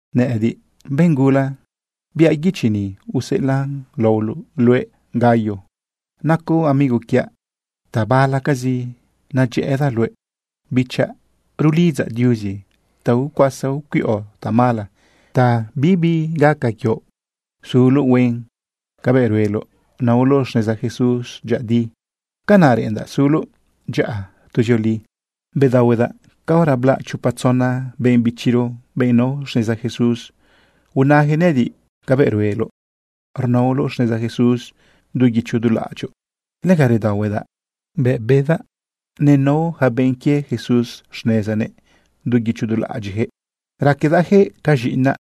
Nëꞌëdiꞌ, benꞌ gula, biaꞌ guichi ni useꞌelaꞌn laoloꞌ luëꞌ, Gayo. Nacoꞌ amigo quiaꞌ, tabalacazi nadyëꞌëdaꞌ luëꞌ. Bichaꞌ, rulidzaꞌ Diuzi ta icuasa icuiꞌo tamala ta bibi gaca quioꞌ suloꞌ huen. Cabëꞌ rueloꞌ naoloꞌ xneza Jesús dyëꞌëdi, canaꞌ reꞌendaꞌ suloꞌ dyaꞌa tuzioli. Bedaohuedaꞌ caora blaꞌ chopa tzona benꞌ bichiro, benꞌ nao xneza Jesús, unajëꞌ nëꞌëdiꞌ cabëꞌ rueloꞌ rnaoloꞌ xneza Jesús du guicho du laꞌadyoꞌ. Lega redaohuedaꞌ bëꞌ bedaꞌ nenao yaca benꞌ quie Jesús xnezanëꞌ du guicho du laꞌadyiꞌjëꞌ. Raquedaꞌyaquëꞌ ca z̃iꞌinaꞌ.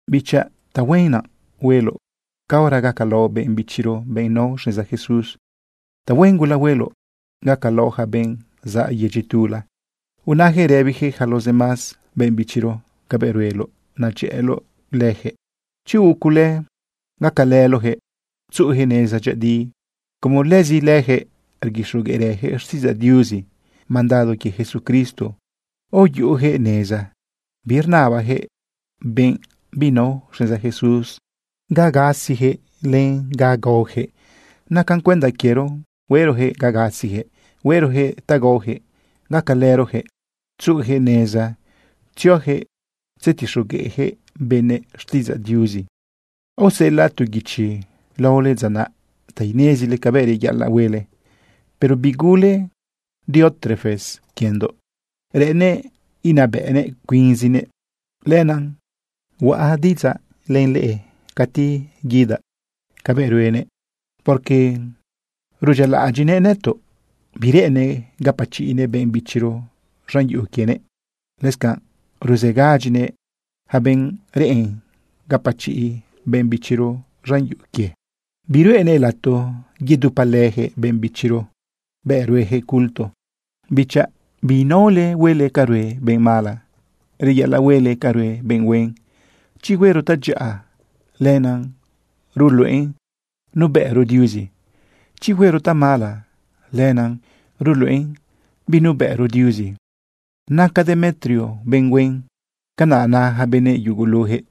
Bichaꞌ, tahuen naꞌ hueloꞌ caora gacalaoꞌ benꞌ bichiro, benꞌ nao xneza Jesús. Tahuen gula hueloꞌ gacalaoꞌ yaca benꞌ zaꞌ yedyi tula. Unajëꞌ rëbijëꞌ yaca los demás benꞌ bichiro cabëꞌ rueloꞌ nadyëꞌëloꞌ lëjëꞌ. Chi huuꞌ cule, gacalëloꞌjëꞌ tzuꞌujëꞌ neza dyëꞌëdi, como lëzi lëjëꞌ rguixogueꞌrëjëꞌ xtiꞌidzaꞌ Diuzi. Mandado quie Jesucristo aoyuꞌujëꞌ neza. Birnabajëꞌ benꞌ binao xneza Jesús ta gasijëꞌ len ta gaojëꞌ. Nacan cuenda quiero hueꞌrojëꞌ ga gasijëꞌ, hueꞌrojëꞌ ta gaojëꞌ, gacalërojëꞌ tzuꞌujëꞌ neza tziojëꞌ tzetixogueꞌjëꞌ benëꞌ xtiꞌidzaꞌ Diuzi. Aoseꞌelaꞌ tu guichi laole dza naꞌ ta inezile cabëꞌ reyaꞌalaꞌ huele. Pero bigule Diótrefes quiendoꞌ. Reꞌennëꞌ inabëꞌnëꞌ cuinzinëꞌ. Lenaꞌ huaꞌ diꞌidzaꞌ len leꞌe cati guidaꞌ cabëꞌ ruenëꞌ, porque rudyialaꞌadyiꞌnëꞌ nëtoꞌ. Bireꞌennëꞌ gapachiꞌnëꞌ benꞌ bichiro z̃an yuꞌu quienëꞌ. Lëscanꞌ ruzegadyinëꞌ yaca benꞌ reꞌen gapachiꞌ benꞌ bichiro z̃an yuꞌu quie. Biruꞌenëꞌ lato yedupalëjëꞌ benꞌ bichiro bëꞌ rueyaquëꞌ culto. Bichaꞌ, biinaole huele ca rue benꞌ mala. Reyaꞌalaꞌ huele ca rue benꞌ huen. Chi huero tadyaꞌa, lenaꞌ ruluꞌen nubëꞌro Diuzi. Chi huero tamala, lenaꞌ ruluꞌen binubëꞌro Diuzi. Naca Demetrio benꞌ huen, canaꞌ na yaca benëꞌ yugulujëꞌ.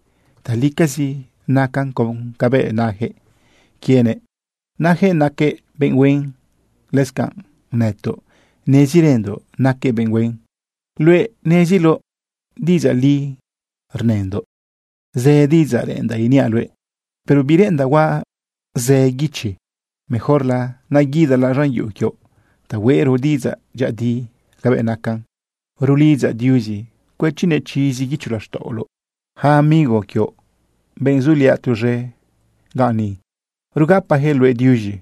Talicazi nacan con cabëꞌ najëꞌ quienëꞌ najëꞌ naquëꞌ benꞌ huen. Lëscanꞌ nëtoꞌ, nezirëndoꞌ naquëꞌ benꞌ huen. Luëꞌ neziloꞌ diꞌidzaꞌ li rnëndoꞌ. Zë diꞌidzaꞌ reꞌendaꞌ iniaꞌ luëꞌ, pero bireꞌendaꞌ huaꞌ zë guichi. Mejorla naguidalaꞌ z̃an yuꞌu quioꞌ ta hueꞌro diꞌidzaꞌ dyëꞌëdi cabëꞌ nacan. Rulidzaꞌ Diuzi cuëchinëꞌ chizi guicho laxtaꞌoloꞌ. Yaca amigo quioꞌ, benꞌ zuliaꞌ tuz̃e ganꞌ ni, rugapayaquëꞌ luëꞌ diuz̃i.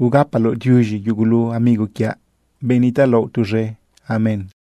Ugapaloꞌ diuz̃i yugulu amigo quiaꞌ, benꞌ nitaꞌlaoꞌ tuz̃e. Amén.